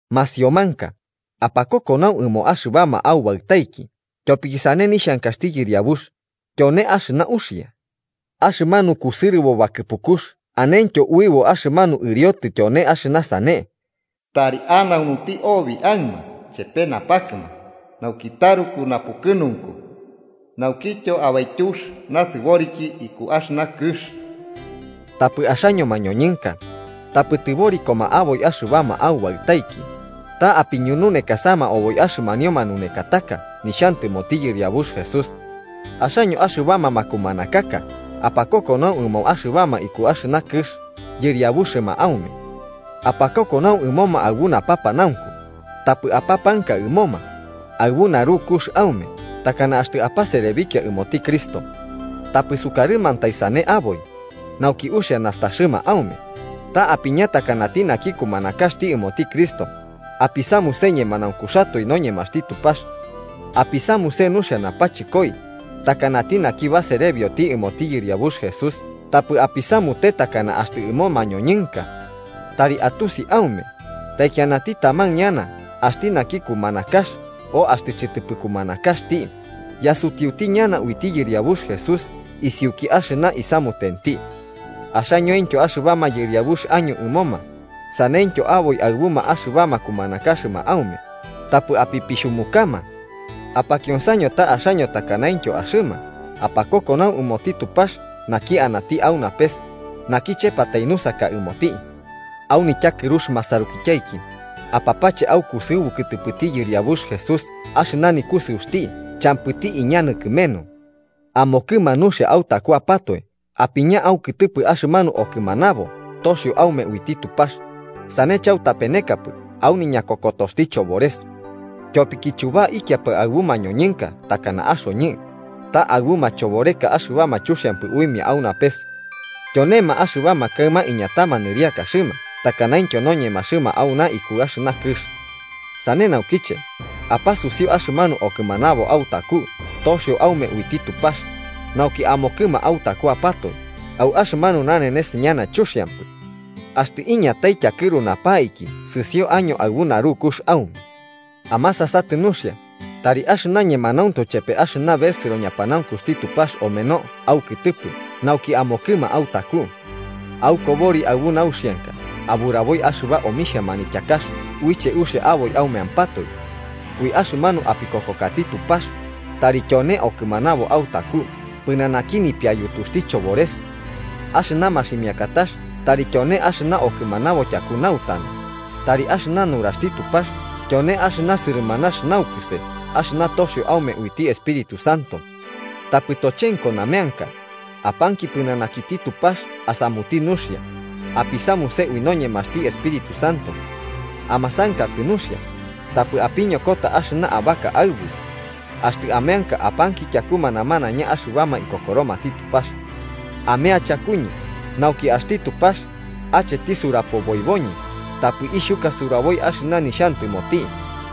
Masiomanka, apakokonau ɨmoma axɨbama aubaɨtaiki tyopiki sane nixhankaxti Yɨriabux, tyone axɨna uxia. Axɨmanu kusɨrɨbo bakɨpukux anentyo uɨbo axɨmanu ɨriotɨ tyone axɨna sane: “Tari anaunuti obi aɨma chepe napakɨma, nauki taruku napukɨnunku naukityo abaityux nasɨboriki iku axɨna kɨx.” Tapɨ axaño mañonɨnka, tapɨ tɨborikoma aboi axɨbama aubaɨtaiki, ta apiñununekasama oboi axɨmanio manunekataka nixhantɨmoti Yɨriabux Jesús. Axaño axɨbama makumanakaka apakokonau ɨmoma axɨbama iku axɨna kɨx yɨriabuxɨma aume. Apakokonau ɨmoma aɨbu napanaunku, tapɨ apapanka ɨmoma, aɨbu narukux aume, takana axtɨ apaserebikiapɨ ɨmoti Cristo. Tapɨ sukarɨmantai sane aboi, nauki uxia nastaxɨma aume, ta apiña takanati naki kumanakaxti ɨmoti Cristo, apisamuse ñemanaunkuxatoe noñemaxti Tupax. Apisamuse nuxia napachɨkoi, takanati naki baserebioti ɨmoti Yɨriabux Jesús tapɨ apisamute takana axtɨ ɨmo mañoñɨnkatai. Tari atusi aume, taikianati taman ñana axti naki kumanakax o axtɨ chɨtɨpɨ kumanakaxti, yasutiuti ñana uiti Yɨriabux Jesús isiuki axɨna isamutenti. Axañointyo axɨbama yɨriabux año ɨmoma, saneityo aboi aɨbuma axɨbama kumanakaxɨma aume, tapɨ apipixhumukama. Apakionsaño ta axaño takanaintyo axɨma apakokonau ɨmoti Tupax naki anati au napes, naki chepatai nusaka ɨmoti. Au nityakɨrux masarukityaiki, apapache aukusɨubu kɨtɨpɨti Yɨriabux Jesús axɨna nikusɨuxti champɨti iñanɨ kɨmenu. Amokɨma nuxia autakuapatoe apiña aukɨtɨpɨ axɨmanu okɨmanabo toxio aume uiti Tupax, sane chautapenekapɨ au niñakokotoxti chobores. Tyopiki chubaikiapɨ aɨbu mañoñɨnka takana axoñɨ, ta aɨbu machoboreka axɨbama chuxiampɨ uimia au napes. Tyonema axɨbama kaɨma iñatama nɨriakaxɨma takanaintyo noñemaxɨma auna iku axɨna kɨx. Sane naukiche, apasusiu axɨmanu okɨmanabo autaku toxio aume uiti Tupax, nauki amokɨma autakuapatoe au axɨmanu nanenes ñana chuxiampɨ. Axtɨ iñatai tyakɨru napaiki sɨsio año aɨbu narukux aume. ¡Amasasatɨ nuxia! Tari axɨna ñemanauntu chepe axɨna besɨro ñapanaunkuxti Tupax ameno aukɨtɨpɨ nauki amokɨma autaku. Aukobori aɨbu nauxianka aburaboi axɨba omixhia manityakax uiche uxia aboi aumeampatoe. Ui axɨmanu apikokokati Tupax tari tyone okɨmanabo autaku pɨnanaki nipiayutuxti chobores. Axɨna maximiakatax tari tyone axɨna okɨmanabo tyaku nautanu, tari axɨna nuraxti Tupax tyone axɨna sɨrɨmanax naukɨse axɨna toxio aume uiti Espíritu Santo. Tapɨ tochenko nameanka. Apanki pɨnanakiti Tupax asamuti nuxia, apisamuse ui noñemaxti Espíritu Santo. Amasankatɨ nuxia, tapɨ apiñokota axɨna abaka aɨbu. Axtɨ ameanka apanki tyakuma namanaiña axɨbama ikokoromati Tupax. Amea chakuñɨ, nauki axti Tupax acheti surapoboiboñɨ, tapɨ ixhuka suraboi axɨna nixhantɨmoti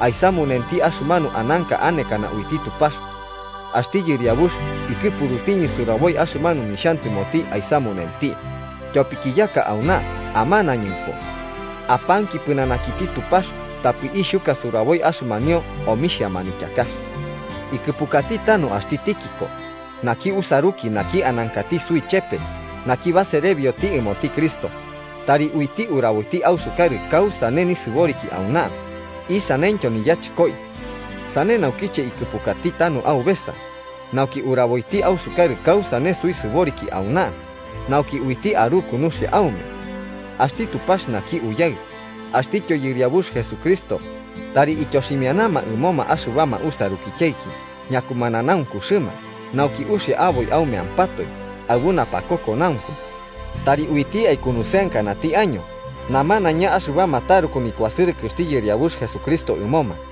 aisamunenti axɨmanu ananka anekana uiti Tupax. Axti Yɨriabux ikɨpurutiñɨ suraboi axɨmanu nixhantɨmoti aisamunenti, tyopiki yaka auna amanañɨmpo. Apanki pɨnanakiti Tupax tapɨ ixhuka suraboi axɨmanio omixhia manityakax. Ikɨpukati tanu axti Tíquico, naki usaruki naki anankati suichepe naki baserebioti ɨmoti Cristo, tari uiti uraboiti ausukarɨ kausane nisɨboriki auna, isaneityo niyachɨkoi. Sane naukiche ikɨpukati tanu aubesa, nauki uraboiti ausukarɨ kausane suisɨboriki auna nauki uiti aruku nuxia aume. Axti Tupax naki Uyaɨ axtityo Yɨriabux Jesucristo, tari ityoximianama ɨmoma axɨbama usarukityaiki ñakumananaunkuxɨma nauki uxia aboi aumeampatoe aɨbu napakokonaunku. Tari uiti aikunusɨankanati año namanaiña axɨbama taruku nikuasɨrɨkɨxti Yɨriabux Jesucristo ɨmoma.